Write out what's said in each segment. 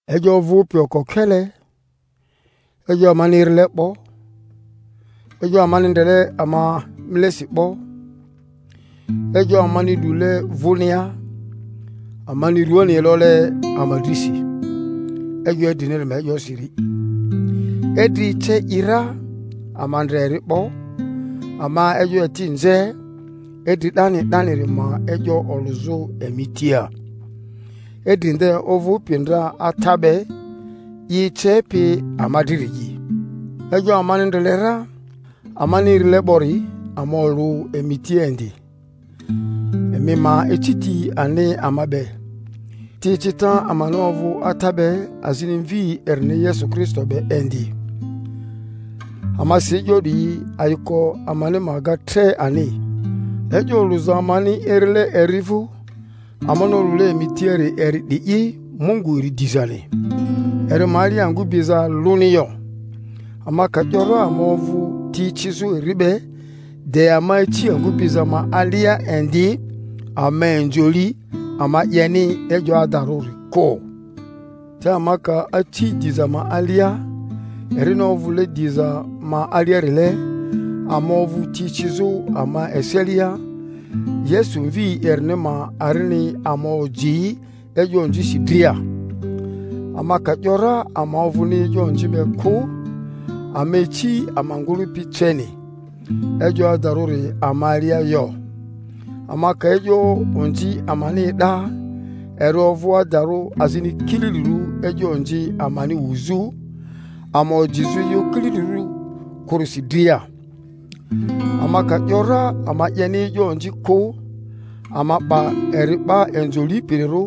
E'yo ovᴜpi okokele, e'yo amani erile 'bo, e'yo amani ndrele ama inilesi 'bo, e'yo amani lule vᴜnia, amani ruani elole ama drisi, E'yo idriniri ma e'yosiri— idri ece i ra, ama ndre eri 'bo, ama e'yo eti nze, idri 'dani 'daniri ma e'yo olᴜzᴜ emi tia, idri nde ovᴜpi ndra Ata be, i ecepi ama driri'i— e'yo amani ndre le ra, amani erile 'bori, ama olᴜ emi tia indi, emi ma eci ti ani ama be; ti ecita amani ovᴜ Ata be azini Mvi erini Yesu Kristo be indi. Ama si e'yo 'diyi, ayiko amani ma ga tre ani. E'yo oluza amani erile eri vu, amani olule emi tiari eri 'di'i Mungu eri dizani, eri ma alia angu biza aluni yo. Ama ka 'yo ra ama ovᴜ ti ecizᴜ eri be, de ama aci angᴜ biza ma alia indi, ama inzo li, ama 'yeni e'yo adarᴜri kᴜ; te ama ka aci diza ma alia, erini ovᴜle diza ma aliarile, ama ovᴜ ti ecizᴜ ama eselia, Yesu Mvi erini ma arini ama oji e'yo onzisi dria. Ama ka 'yo ra ama ovᴜni e'yo onzi be kᴜ, ama ici ama ngᴜlᴜpi ceni, e'yo adarᴜri ama alia yo. Ama ka e'yo onzi amani e'da, eri ovᴜ adarᴜ azini kililirᴜ e'yo onzi amani wuzᴜ, ama ojizᴜ e'yo kililirᴜ kᴜrisi dria. Ama ka 'yo ra ama 'yeni e'yo onzi kᴜ, ama 'ba eri 'ba inzo lipirirᴜ,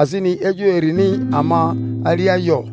azini e'yo erini ama alia yo.